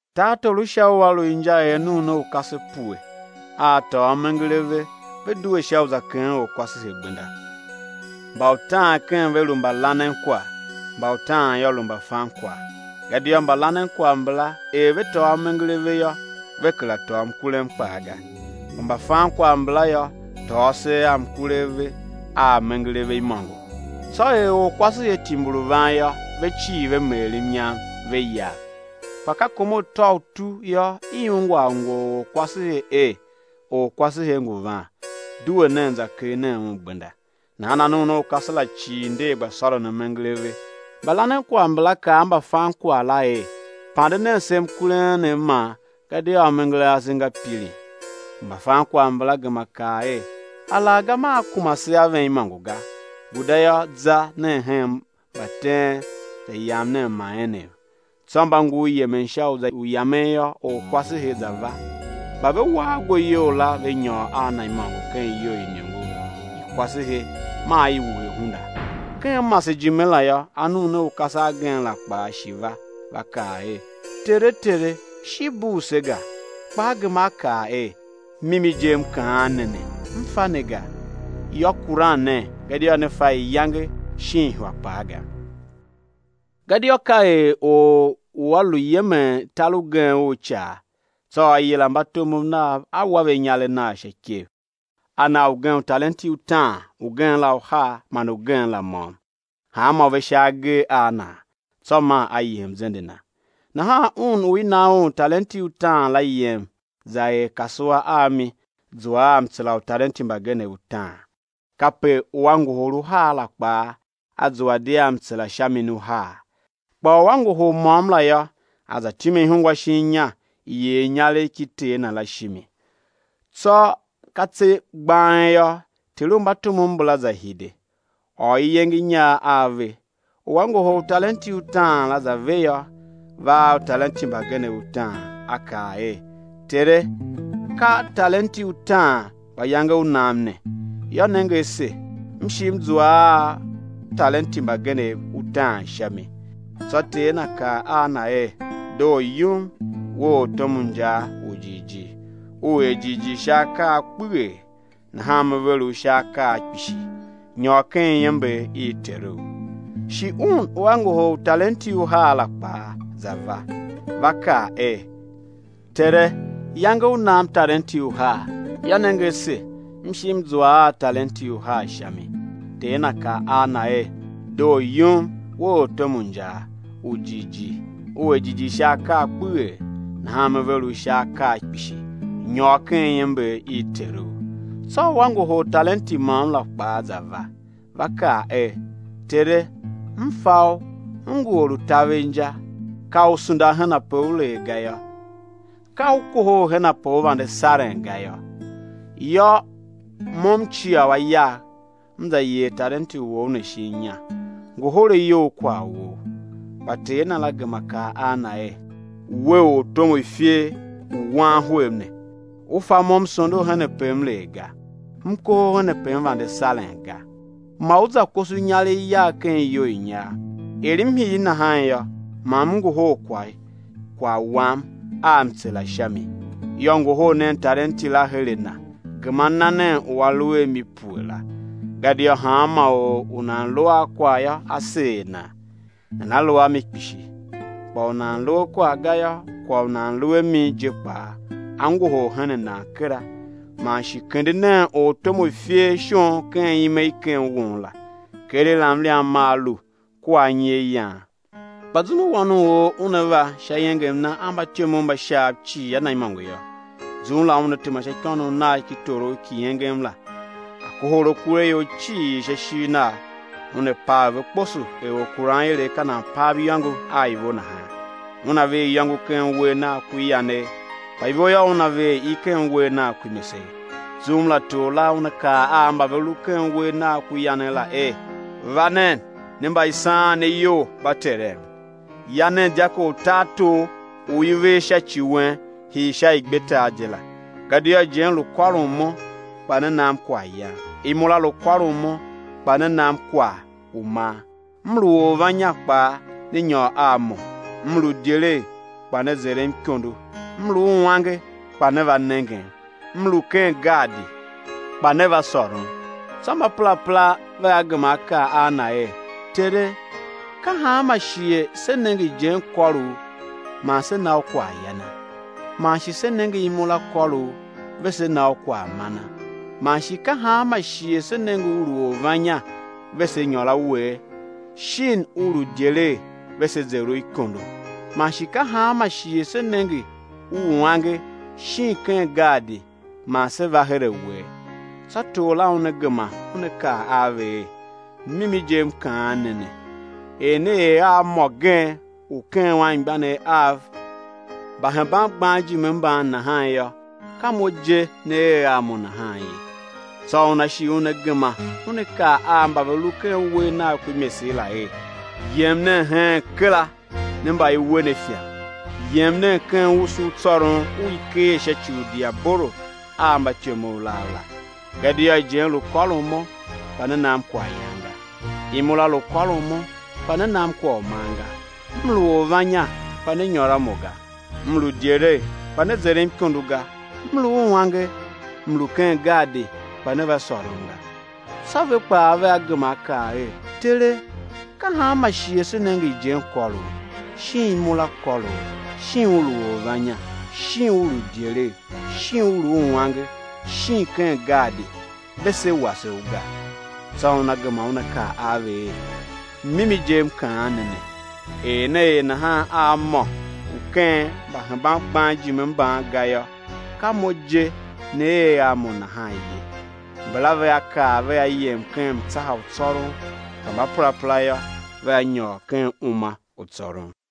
Tartor u Sha ua lu inja er anuunaukase pue, a a tôô amenger a ve, ve due sha u za keghen orkwasehe gbenda. Mba utaan ken ve lu mbalanenkwagh, mba utaan yô, lu mbafankwagh. Gadia mbalanenkwagh mbala, er ve tôô amenger a ve yô, ve kera tôô mkurem kpaa ga. Kpa mbafankwagh mbala yô, tôô asegh a mkure a ve a amenger a ve imôngo. Tsô er orkwasehe timbir u van yô, ve cii ve meer mnyam, ve yav. Kpa ka kom atôutu yô, i ungwa angwe u orkwasehe er: Orkwasehe ngu van, due nen za kegh nen un gbenda! Nahan anuunaukase la cii nder, gba sôron amenger a ve. Mbalanenkwagh mbala kaa a mbafankwagh la er: Pande nen se mkurem enem man, gadia amenger ase nga pirin. Kpa mbafankwagh mbala gema kaa er: Alaghga maa kuma se a ven imôngo ga. Guda yô, za nen hen mbateen, za yam nen ma enem. Tsô mba ngur yemen sha u za yamen yô, orkwasehe za va; mba ve wa ago iyol la ve nyôr a na imôngo ken iyou i iniongo i kwasehe maa i wuhe hunda. Ken masejime la yô, anuunaukase agen la kpaa shi va, va kaa er: Tere Tere, shi bugh se ga! Kpa a gema a kaa er: Mimi je, m kaan ne ne, m fa ne ga. Yô, kuran nen gadia ne fa iyange shin ihwa kpaa ga. Gadia ka er or u a lu yemen tar ugen u icaa; tsô a yila mbatomov nav a wa ve inyaregh nagh sha ikev. A na ugen talenti utaan, ugen la uhar, man ugen la môm; hanmô ve sha agee a nan; tsô maa a yem zende na. Nahan un u i na un talenti utaan la, yem za er kasua a mi, zua a mtsera utalenti mbagenev utaan. Kape u a ngohol uhar la kpaa, a zua di a mtsera sha mi uhar. Kpa u a ngohol môm la yô, a za time ihungwa shin inya, yer inyaregh ki ter na la shimi. Tsô ka tse gbang yô, ter u mbatomov mbala za hide, ôr iyenge i inyar a ve. U a ngohol talenti utaan la za ve yô, va a talenti utaan a kaa er: Tere, ka talenti utaan mba iyange u nam ne; yô, nenge ase, m shi m zua a talenti mbagenev utaan sha mi. Tsô ter na kaa a na er: Doo yum, we ortom u injaa u jighjigh, u er jighjigh sha akaa a kpeghee, nahan me ver u sha akaa kpishi. Nyôr ken iember i teru. Shi un u a ngohol talenti uhar la kpaa, za va, va kaa er: Tere, iyange u nam talenti uhar: yô, nenge ase, m shi m zua a talenti uhar sha mi. Ter na kaa a na er: Doo yum, we ortom u injaa, u jighjigh, u er jighjigh sha akaa kpeghee; nahan me ver u sha akaa kpishi. Nyôr ken iember i teru. Tsô u a ngohol talenti môm la, kpaa za va, va kaa er: Tere, m fa u, u ngu or u taver inja; ka u sunda henpe u lee ga yô, ka u kohol henpe u vande saren ga yô. Yô, mo m cia a yagh, m za yer talenti wou ne shin inya; ngohol a you kwagh wou. Kpa ter na la gema kaa a na er: We, ortom u ifer u wan hwev ne, u fa mo m sondo henpe m lee ga, m kohol henpe m vande saren ga. Ma u za koso inyaregh yagh ken iyou i inyar, er m hir nahan yô, ma m ngohol kwagh wam a mtsera sha mi. Yô, ngohol nen talenti la her a na, gema na nen u a lu a mi pue la, gadia hanma or u nan lu a kwagh yô, á seer nan, nana lu a mi kpishi; kpa u nan lu a kwagh ga yô, kwagh u nan lu a mi je kpaa, á ngohol hen nan kera. Man shi kende nen ortom u ifer shon ken ime i ken won la, keregh la mliam maa lu kua anyi a yan. Kpa zum u Wan u or Una va sha iengem Na a mbatyomov mba Shaav cii a Na imôngo yô, zum la Una tema sha ikônough Nagh ki torough ki engem la; á kohol akuraior cii sha ishigh Nagh, Una pav ve kposo er orkuranilev ka nan pav iyôngo a ivo nahan. Una ver iyôngo ken uwegh Nagh ku yanegh, kpa ivo yô, Una ver i ken uwegh Nagh ku imesegh. Zum la Tor la Una kaa a mba ve lu ken uwegh Nagh ku yanegh la er: Va nen, ne mba i saan ne iyol mba Terem, ya nen dyako u tartor u i ver sha ci wen hii sha igbetar je la. Gadia ijen lu kôron Mo, kpa ne nam kwaghyan; imura lu kôron Mo, kpa ne nam kwagh u man; M lu orvannya kpa ne nyôr a Mo; M lu idyelegh, kpa ne zerem ikondo; M lu uange, kpa ne va nengem; M lu ken gaadi, kpa ne va sôrom. Tsô mbaperapera vea gema á kaa a Na er: Tere, ka hanma shighe se nenge ijen kôr U man se na U kwaghyana? Man shi se nenge imura kôr U ve se na U kwaghmana? Man shi ka hanma shighe se nenge U lu orvannya ve se nyôr a Wee? Shin U lu idyelegh ve se zer U ikondo? Man shi ka hanma shighe se nenge U uange shin ken gaadi man se va her a Wee? Tsô Tor la Una gema Una kaa a ve er: Mimi je M kaan ne ne, er ne er a mô gen u ken anmgbianev Av mba hemban gban ijime mban nahan yô, ka Mo je ne er a Mo nahan ye. Tsô Una shi Una gema Una kaa a mba ve lu ken uwegh Nagh ku imesegh la er: Yem nen heen kera, ne mba i we ne ifan, yem nen ken usu u tsôron u i keer sha ci u diabolo a mbatyomov nav la. Gadia ijen lu kôron Mo, kpa ne nam kwaghyan ga; imura lu kôron Mo, kpa ne nam kwagh u man ga; M lu orvannya, kpa ne nyôr a Mo ga; M lu idyelegh, kpa ne zerem ikondo ga; M lu uange, M lu ken gaadi, kpa ne va sôrom ga! Tsô ve kpaa vea gema á kaa er: Tere, ka hanma shighe se nenge ijen kôr U, shin imura kôr U, shin U lu orvannya, shin U lu uange, shin ken gaadi ve se wase U ga? Tsô Una gema Una kaa a ve er: Mimi je M kaan ne ne, er ne er nahan a mô u ken mba hemban gban ijime mban ga yô, ka Mo je ne er a Mo nahan ye. Mbala vea kar vea yem ken mtsaha u tsôron; kpa mbaperapera yô, vea nyôr ken uma u tsôron.